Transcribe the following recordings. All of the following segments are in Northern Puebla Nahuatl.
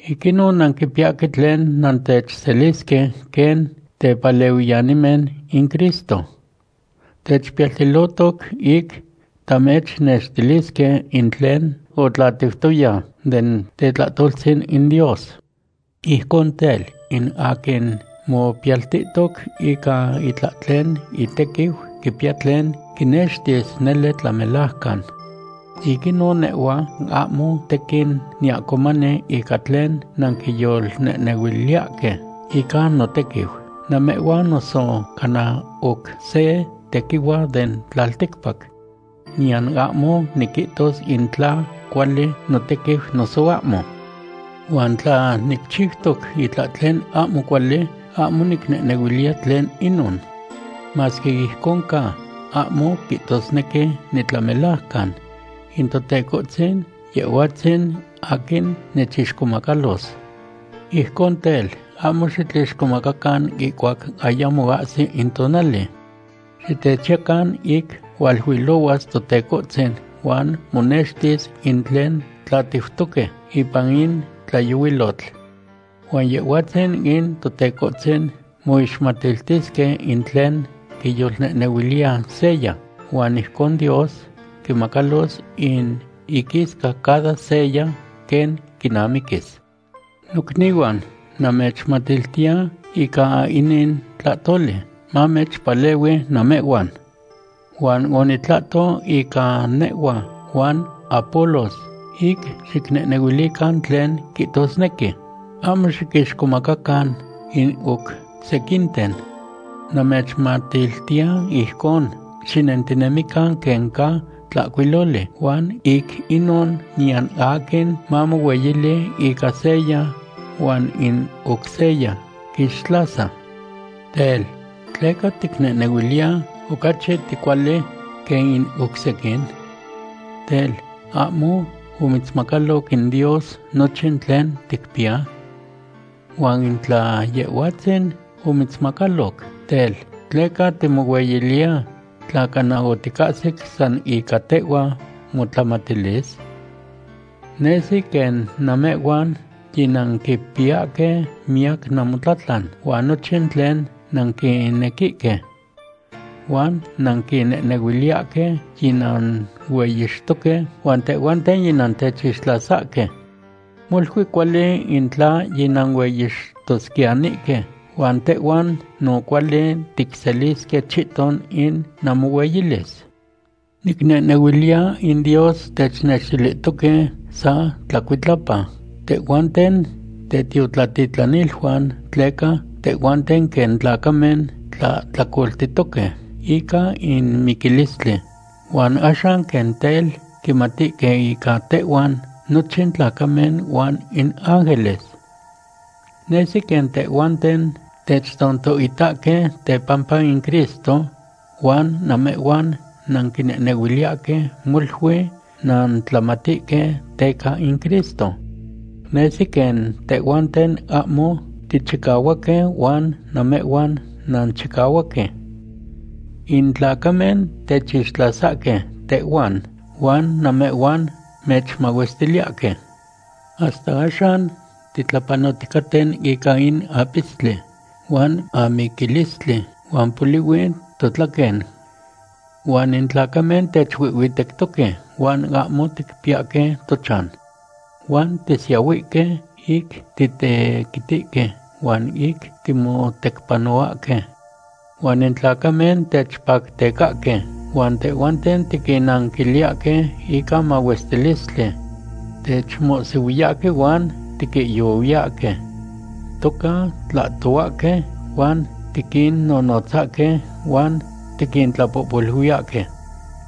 Ic inon nanquipiyahque tlen nantechselisque quen tepalehuiyanimen in Cristo. Techpiyaltilohtoc ic tamechnextilisque in tlen otlatiutoya den tetlahtoltzin in Dios. Ijcon tel, in aquin mopiyaltihtoc ica itlahtlen itequiu quipiya tlen quinextis nele tlamelajcan. Ic inon nehhua ahmo tequin niahcomani ica tlen nanquiyolnehnehuiliyahque ica notequiu, namehhuan noso cana oc se tequihua den tlalticpac. Niyan ahmo niquihtos in tla cuali notequiu noso ahmo. Huan tla nicchiutoc itlahtlen ahmo cuali, ahmo nicnehnehuiliya tlen inon. Masque ijcon ca, ahmo quihtosnequi nitlamelajcan. In Totecohtzin, Yehhuatzin aquin nechixcomacalos. Ijcon tel, ahmo xitlixcomacacan ihcuac ayamo ahsi in tonali. Xitechiyacan ic hualuilohuas Totecohtzin huan monextis in tlen tlatiutoque ipan in tlayohuilotl. Huan Yehhuatzin in Totecohtzin moixmatiltisque in tlen quiyolnehnehuiliya seya, huan ijcon Dios quimacalos in iquisca cada seya quen quinamiquis. Nocnihuan, namechmatiltiya ica inin tlahtoli, mamechpalehui namehhuan. Huan onitlahto ica nehhua huan Apolos ic xicnehnehuilican tlen quihtosnequi: “Ahmo xiquixcomacacan in oc sequinten.” Namechmatiltiya ijcon xinentinemican quen ca tlahcuiloli, huan ic inon niyan aquin mamohueyili ica seya huan in oc seya quixtlasa. Tel, ¿tleca ticnehnehuiliya ocachi ticuali quen in oc sequin? Tel, ¿ahmo omitzmacaloc in Dios nochin tlen ticpiya? Huan in tla Yehhuatzin omitzmacaloc, tel, ¿tleca timohueyiliya tla cana oticahsic san ica tehhua motlamatilis? Nesi quen namehhuan yinanquipiyahque miyac namotlatlan huan nochin tlen nanquinequihque. Huan nanquinehnehuiliyahque yinanueyixtoque huan tehhuanten yinantechixtlasahque. Molui cuali in tla yinanueyixtosquiyanihque huan tehhuan no cuali ticselisque chihton in namohueyilis. Nicnehnehuiliya in Dios technextilihtoque sa tlacuitlapa tehhuanten tetiotlatitlaniluan, tleca tehhuanten quen tlacamen tlahtlacoltihtoque ica in miquilistli, huan axan quen tel quimatihque ica tehhuan nochin tlacamen huan in ángeles. Nesi quen tehhuanten techtontohitahque tepampa in Cristo, huan namehhuan nanquinehnehuiliyahque molui nantlamatihque teca in Cristo. Nesi quen tehhuanten ahmo tichicahuaque huan namehhuan nanchicahuaque. In tlacamen techixtlasahque tehhuan huan namehhuan mechmahuestiliyahque. Hasta axan titlapanoticaten ica in apistli, huan amiquilistli, huan polihui totlaquen. Huan in tlacamen techuihhuitectoque huan ahmo ticpiyahque tochan. Huan tisiyahuihque ic titequitihque huan ic timotecpanohuahque. Huan in tlacamen techpactecahque huan tehhuanten tiquinnanquiliyahque ica mahuestilistli. Techmohsihuiyahque huan tiquihyohuiyahque. Toca tlahtohuahque huan tiquinnonotzahque, huan tiquintlapohpoluiyahque.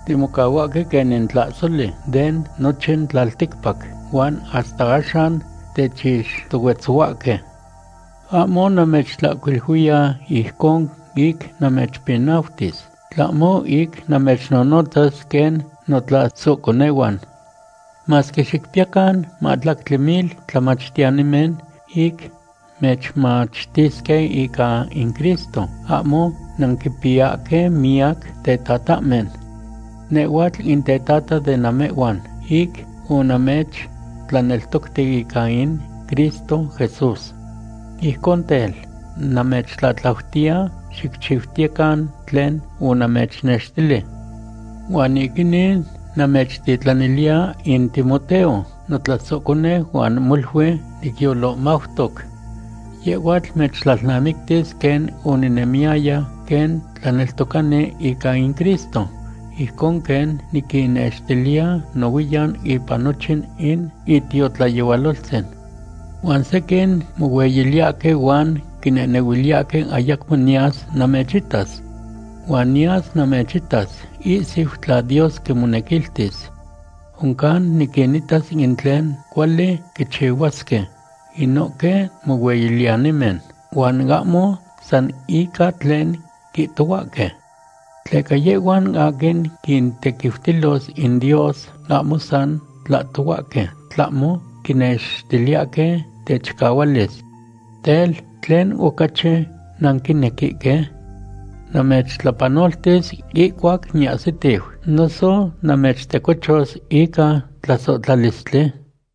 Timocahuahque quen in tlahsoli den nochin tlalticpac, huan hasta axan techixtohuetzohuahque. Ahmo namechtlahcuiliuiya ijcon ic namechpinautis, tlahmo ic namechnonotzas quen notlasohconehuan. Masque xicpiyacan mahtlactli mil tlamachtiyanimen ic mechmachtisque ica in Cristo, ahmo nanquimpiyahque miyac tetatahmen. Nehhuatl in tetata de namehhuan ic onamechtlaneltocti ica in Cristo Jesús. Ijcon tel, namechtlatlautiya, xicchiutiyecan tlen onamechnextili. Huan ic inin namechtitlaniliya in Timoteo, notlasohconeu huan molui nicyolohmautoc. Yehhuatl mechtlalnamictis quen oninemiyaya quen tlaneltocani ica in Cristo, ijcon quen niquinnextiliya nohuiyan ipan nochin in itiotlayehualoltzin. Huan sequin mohueyiliyahque huan quinehnehuiliyahque ayacmo niyas namechitas. Huan niyas namechitas ihsiu tla Dios quimonequiltis. Oncan niquinitas in tlen cuali quichihuasque inohque mohueyiliyanimen, huan ahmo san ica tlen quihtohuahque. Tleca yehhuan aquin quintequiutilos in Dios ahmo san tlahtohuahque, tlahmo quinextiliyahque techicahualis. Tel, ¿tlen ocachi nanquinequihque? ¿Namechtlapanoltis ihcuac niahsitiu, noso namechtecochos ica tlasohtlalistli?